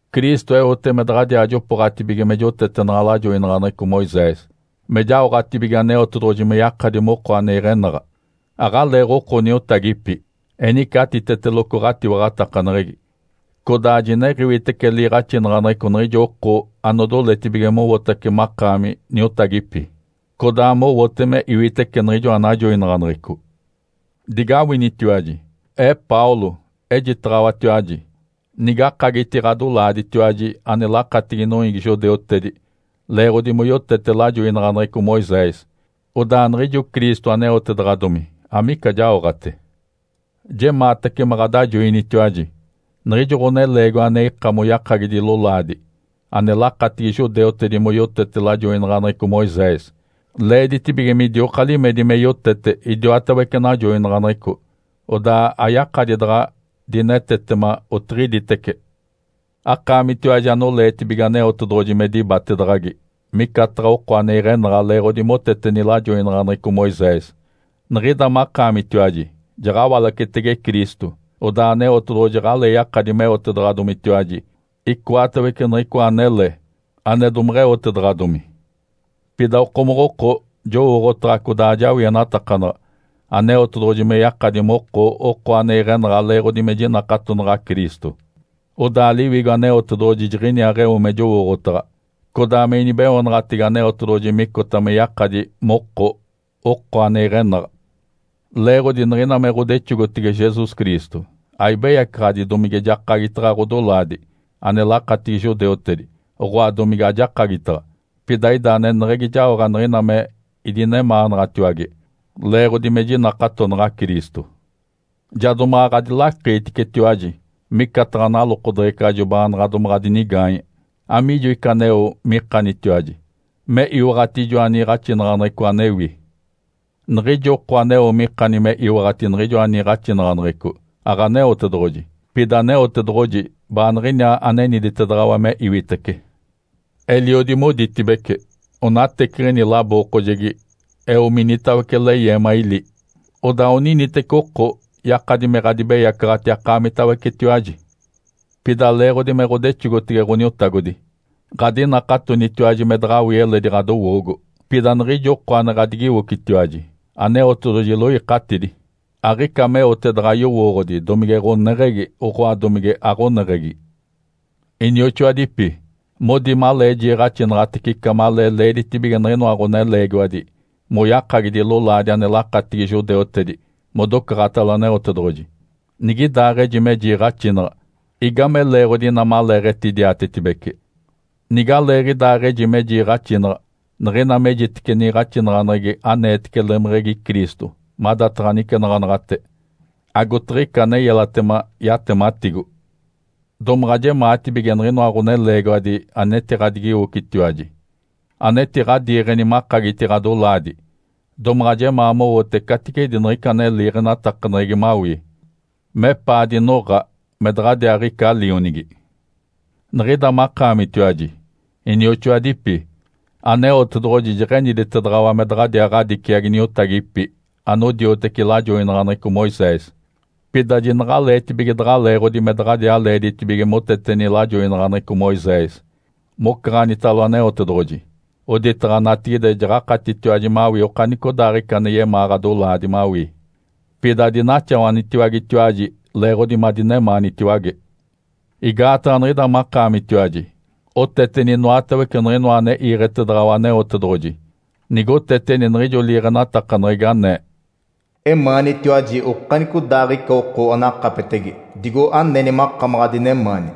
Cristo eote me daɡ̶adiaa jopooɡ̶atibige me jotetenaɡ̶a lajoinaɡ̶aneɡ̶eco Moisés me jaoɡ̶atibige Aneotedoɡ̶oji me yakadi moko ane iɡ̶enaɡ̶a. Aɡ̶aleeɡ̶oko niotagipi. Enice atiteteloco ɡ̶atiwaɡ̶atakaneɡ̶egi, codaa jiniɡ̶iwitece liiɡ̶axinaɡ̶aneɡ̶eco niɡ̶ijo oko anodoletibige mowotace makaami niotagipi, codaa mowote me iwitece niɡ̶ijoa najoinaɡ̶aneɡ̶eco. Digawinitiwaji! Ee Paulo, ejitaɡ̶awatiwaji. Nigakagiti ɡ̶adolaaditiwaji ane lakatigi noiigi judeutedi leeɡ̶odi moyotete lajoinaɡ̶aneɡ̶eco Moisés, odaa niɡ̶ijo Cristo aneotedaɡ̶adomi amica jaoɡ̶ate. Jemaatace me ɡ̶adajoinitiwaji. Niɡ̶ijo ɡ̶oneleegiwa ane ika moyakagidi lolaadi ane lakatigi judeutedi moyotete lajoinaɡ̶aneɡ̶eco Moisés, leeditibige midioka limedi me yotete idiwatawece najoinaɡ̶aneɡ̶eco, odaa ayakadi daɡ̶a dinetetema otiɡ̶iditece. Akaamitiwaji anoleetibige Aneotedoɡ̶oji me dibatedaɡ̶agi micataɡ̶a oko ane iɡ̶enaɡ̶a leeɡ̶odi moteteni lajoinaɡ̶aneɡ̶eco Moisés, niɡ̶ida makaamitiwaji jaɡ̶awalacetege Cristo. Odaa Aneotedoɡ̶oji aɡ̶alee yakadi meotedaɡ̶adomitiwaji icoatawece niɡ̶icoa anele ane domeɡ̶eotedaɡ̶adomi. Pida okomoɡ̶oko jowooɡ̶otaɡ̶a codaa ajawienatakanaɡ̶a Aneotedoɡ̶oji me yakadi moko oko ane iɡ̶enaɡ̶a leeɡ̶odi me jinakatonaɡ̶a Cristo. Odaa Liwigo Aneotedoɡ̶oji jiɡ̶iniaaɡ̶eo me jowooɡ̶otaɡ̶a, codaa me inibeoonaɡ̶atege Aneotedoɡ̶oji micota me yakadi moko oko ane iɡ̶enaɡ̶a. Leeɡ̶odi niɡ̶ina me ɡ̶odexogotege Jesus Cristo, aibeyacaɡ̶adi domige jakagitaɡ̶a ɡ̶odolaadi ane lakatigi judeutedi, oɡ̶oa domige ajakagitaɡ̶a. Pida ida aneneɡ̶egi jaoɡ̶a niɡ̶ina me idinemaanaɡ̶atiwage leeɡ̶odi me jinakatonaɡ̶a Cristo. Ja domaɡ̶a ɡ̶adilakiiticetiwaji micataɡ̶a nalokodeɡ̶ecajo baanaɡ̶a domaɡ̶a dinigaanye. Amiijo ica aneo mikanitiwaji me iwaɡ̶ati ijoa niiɡ̶axinaɡ̶aneɡ̶eco anewi? Niɡ̶ijo oko aneo mikani me iwaɡ̶ati niɡ̶ijoa niiɡ̶axinaɡ̶aneɡ̶eco, aɡ̶Aneotedoɡ̶oji. Pida Aneotedoɡ̶oji baaniɡ̶iniaa aneniditedaɡ̶awa me iwitece. Eliodi moditibece, “Onateciɡ̶ini labookojegi eo minitawece leyeema ili.” (Odaa oniniteci oko yakadi me ɡ̶adibeyacaɡ̶ati akaamitawecetiwaji.) Pida leeɡ̶odi me ɡ̶odexogotege Ǥoniotagodi, ɡ̶adinakatonitiwaji me daɡ̶awii eledi ɡ̶adowoogo. Pida niɡ̶ijo oko ane ɡ̶adigiwocitiwaji, Aneotedoɡ̶oji iloikatidi, aɡ̶ica meote daɡ̶a yowooɡ̶odi domige ɡ̶oneɡ̶egi, oɡ̶oa domige aɡ̶oneɡ̶egi. Inioxoadipi, modi malee jiiɡ̶axinaɡ̶atece ica malee leeditibige niɡ̶inoa ɡ̶oneleegiwadi moyakagidi lolaadi ane lakatigi judeutedi modocaɡ̶atalo Aneotedoɡ̶oji. Nigidaaɡ̶eji me jiiɡ̶axinaɡ̶a, igame leeɡ̶odi inaa maleeɡ̶etidiatetibece? Nigaleeɡ̶idaaɡ̶eji me jiiɡ̶axinaɡ̶a, niɡ̶ina mejitece niiɡ̶axinaɡ̶aneɡ̶egi aneetece lemeɡ̶egi Cristo madataɡ̶a nicenaɡ̶anaɡ̶ate, agotiɡ̶ica ane yelatema yatematigo. Domaɡ̶a jemaatibige niɡ̶inoa ɡ̶oneleegiwadi anetiɡ̶adigiwocitiwaji, anetiɡ̶adiiɡ̶eni makagiti ɡ̶adolaadi, domaɡ̶a jemaa mowote caticedi niɡ̶ica ane liiɡ̶enatakaneɡ̶egi mawii, mepaa dinoɡ̶a me daɡ̶adiaaɡ̶ica lionigi. Niɡ̶ida makaamitiwaji, inioxoadipi, Aneotedoɡ̶oji jeɡ̶eniditedaɡ̶awa me daɡ̶a ɡ̶adiciagi niotagipi anodioteci lajoinaɡ̶aneɡ̶eco Moisés. Pida jinaɡ̶aleetibige daɡ̶a leeɡ̶odi me daɡ̶a leeditibige moteteni lajoinaɡ̶aneɡ̶eco Moisés mocaɡ̶anitalo Aneotedoɡ̶oji, oditaɡ̶a natigide jaɡ̶akatitiwaji mawii okanicodaaɡ̶ica ane yemaa ɡ̶adolaadi mawii. Pida adinaxawanitiwagetiwaji leeɡ̶odi madinemaanitiwage. Igaataɡ̶a niɡ̶ida makaamitiwaji oteteni inoatawece niɡ̶inoa ane iiɡ̶etedaɡ̶awa Aneotedoɡ̶oji, nigoteteni niɡ̶ijo liiɡ̶enatakaneɡ̶egi anee, “Emaanitiwaji okanicodaaɡ̶ica oko anakapetege digo aneni makamaɡ̶a adinemaani.”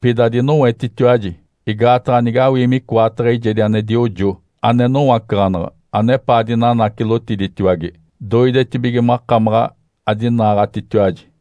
Pida adinowetitiwaji, igaataɡ̶a nigawii micoataɡ̶a eijedi ane diojo ane nowacaɡ̶anaɡ̶a anepaa dinanacilotiditiwage, doidetibige makamaɡ̶a adinaaɡ̶atitiwaji.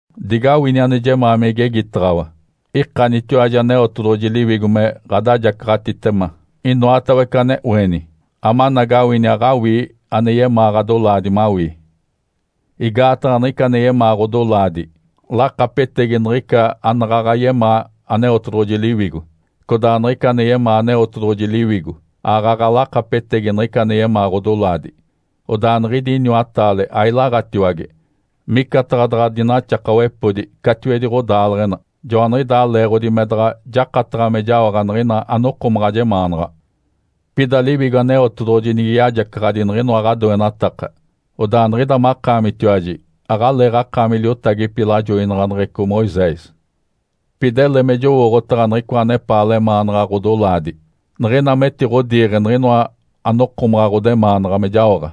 Digawini ane jemaa me igegitaɡ̶awa. Ikanitiwaji Aneotedoɡ̶oji Liwigo me ɡ̶adajacaɡ̶atitema inoatawece ane oeni, amanagawini aɡ̶awii ane yemaa ɡ̶adolaadi mawii. Igaataɡ̶a niɡ̶ica ane yemaa ɡ̶odolaadi lakapetegi niɡ̶ica anaɡ̶aɡ̶a yemaa Aneotedoɡ̶oji Liwigo, codaa niɡ̶ica ane yemaa Aneotedoɡ̶oji Liwigo aaɡ̶aɡ̶a lakapetegi niɡ̶ina ane yemaa ɡ̶odolaadi. Odaa niɡ̶idi iniwataale ailaɡ̶atiwage, micataɡ̶a daɡ̶a dinaxakawepodi catiwedi ɡ̶odaaleɡ̶ena. Joaniɡ̶idaa leeɡ̶odi me daɡ̶a jakataɡ̶a me jaoɡ̶a niɡ̶ina anokomaɡ̶a jemaanaɡ̶a. Pida Liwigo Aneotedoɡ̶oji nige yajacaɡ̶adi niɡ̶inoa ɡ̶adoenataka, odaa niɡ̶ida makaamitiwaji aɡ̶aleeɡ̶akaami liotagipi lajoinaɡ̶aneɡ̶eco Moisés. Pida ele me jowooɡ̶otaɡ̶a niɡ̶icoa anepaa lemaanaɡ̶a ɡ̶odolaadi. Niɡ̶ina metiɡ̶odiiɡ̶e niɡ̶inoa anokomaɡ̶a ɡ̶odemaanaɡ̶a me jaoɡ̶a,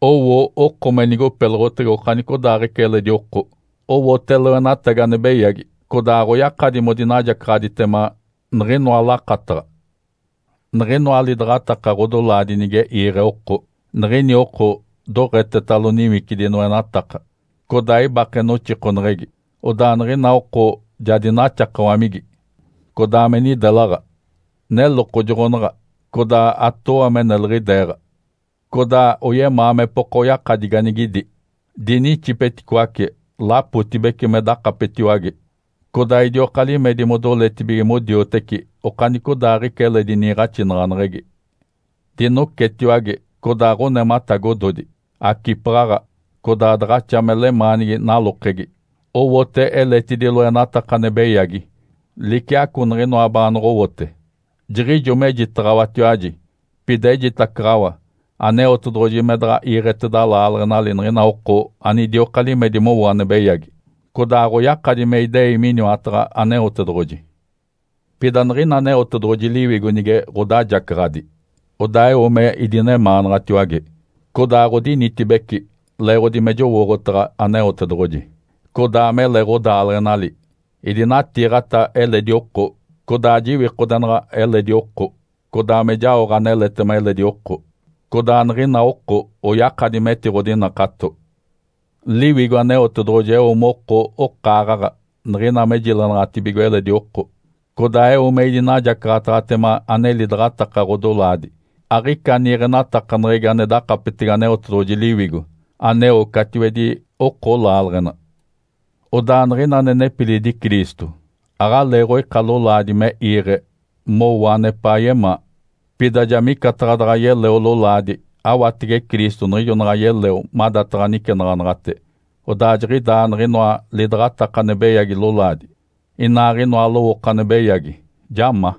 owo oko me nigopeloɡ̶otege okanicodaaɡ̶ica eledi oko, owote loenatagi ane beyagi, codaa aɡ̶oyakadi modinajacaɡ̶aditema niɡ̶inoa lakataɡ̶a. Niɡ̶inoa lidaɡ̶ataka ɡ̶odolaadi nige iiɡ̶e oko, niɡ̶ini oko doɡ̶etetalo niwicidi noenataka, codaa ibake noxikoneɡ̶egi. Odaa niɡ̶ina oko ja dinaxakawamigi, codaa me nidelaɡ̶a. Nelokojoɡ̶onaɡ̶a codaa atooa me neliɡ̶ideeɡ̶a, codaa oyemaa mepoka oyakadi ganigidi. Dinixipeticoace lapotibece me dakapetiwage, codaa idioka limedi modoletibige modioteci okanicodaaɡ̶ica eledi niiɡ̶axinaɡ̶aneɡ̶egi. Dinocetiwage, codaa ɡ̶onematagododi. Acipaɡ̶aɡ̶a, codaa daɡ̶axa me lemaanigi nalokegi. Owote eletidi loenataka ane beyagi liciaco niɡ̶inoa baanoɡ̶owote. Jiɡ̶ijo mejitaɡ̶awatiwaji, pida ejitacaɡ̶awa Aneotedoɡ̶oji me daɡ̶a iiɡ̶eteda laaleɡ̶enali niɡ̶ina oko anidioka limedi mowo ane beyagi, codaa aɡ̶oyakadi me idei miniwataɡ̶a Aneotedoɡ̶oji. Pida niɡ̶ina Aneotedoɡ̶oji Liwigo nige ɡ̶odajacaɡ̶adi, odaa eo me idinemaanaɡ̶atiwage, codaa ɡ̶odinitibece leeɡ̶odi me jowooɡ̶otaɡ̶a Aneotedoɡ̶oji, codaa mele ɡ̶odaaleɡ̶enali. Idinatiiɡ̶ata eledi oko, codaa jiwikodenaɡ̶a eledi oko, codaa me jaoɡ̶a aneletema eledi oko. Codaa niɡ̶ina oko oyakadi metiɡ̶odinakato. Liwigo Aneotedoɡ̶oji eo moko okaaɡ̶aɡ̶a niɡ̶ina me jilenaɡ̶atibigo eledi oko, codaa eo me idinajacaɡ̶ataɡ̶atema ane lidaɡ̶ataka ɡ̶odolaadi. Aɡ̶ica niiɡ̶enatakaneɡ̶egi ane dakapetege Aneotedoɡ̶oji Liwigo aneo catiwedi oko laaleɡ̶ena. Odaa niɡ̶ina ane nepilidi Cristo, aɡ̶aleeɡ̶oika lolaadi me iiɡ̶e mowo anepaa yemaa. Pida ja micataɡ̶a daɡ̶a yeleo lolaadi awatege Cristo niɡ̶ijo naɡ̶a yeleo madataɡ̶a nicenaɡ̶anaɡ̶ate, odaa jiɡ̶idaa niɡ̶inoa lidaɡ̶ataka ane beyagi lolaadi, inaaɡ̶inoa lowooko ane beyagi, ja ma.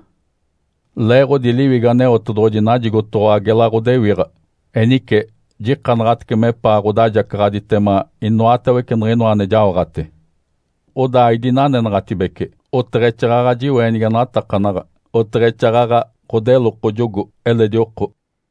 Leeɡ̶odi Liwigo Aneotedoɡ̶oji najigotoɡ̶owa gela ɡ̶odewiɡ̶a. Enice jikanaɡ̶atece mepaa ɡ̶odajacaɡ̶aditema inoatawece niɡ̶inoa ane jaoɡ̶ate. Odaa aidinanenaɡ̶atibece, oteɡ̶exaaɡ̶aɡ̶a jiweenigenatakanaɡ̶a, oteɡ̶exaaɡ̶aɡ̶a ɡ̶odelokojogo eledi oko.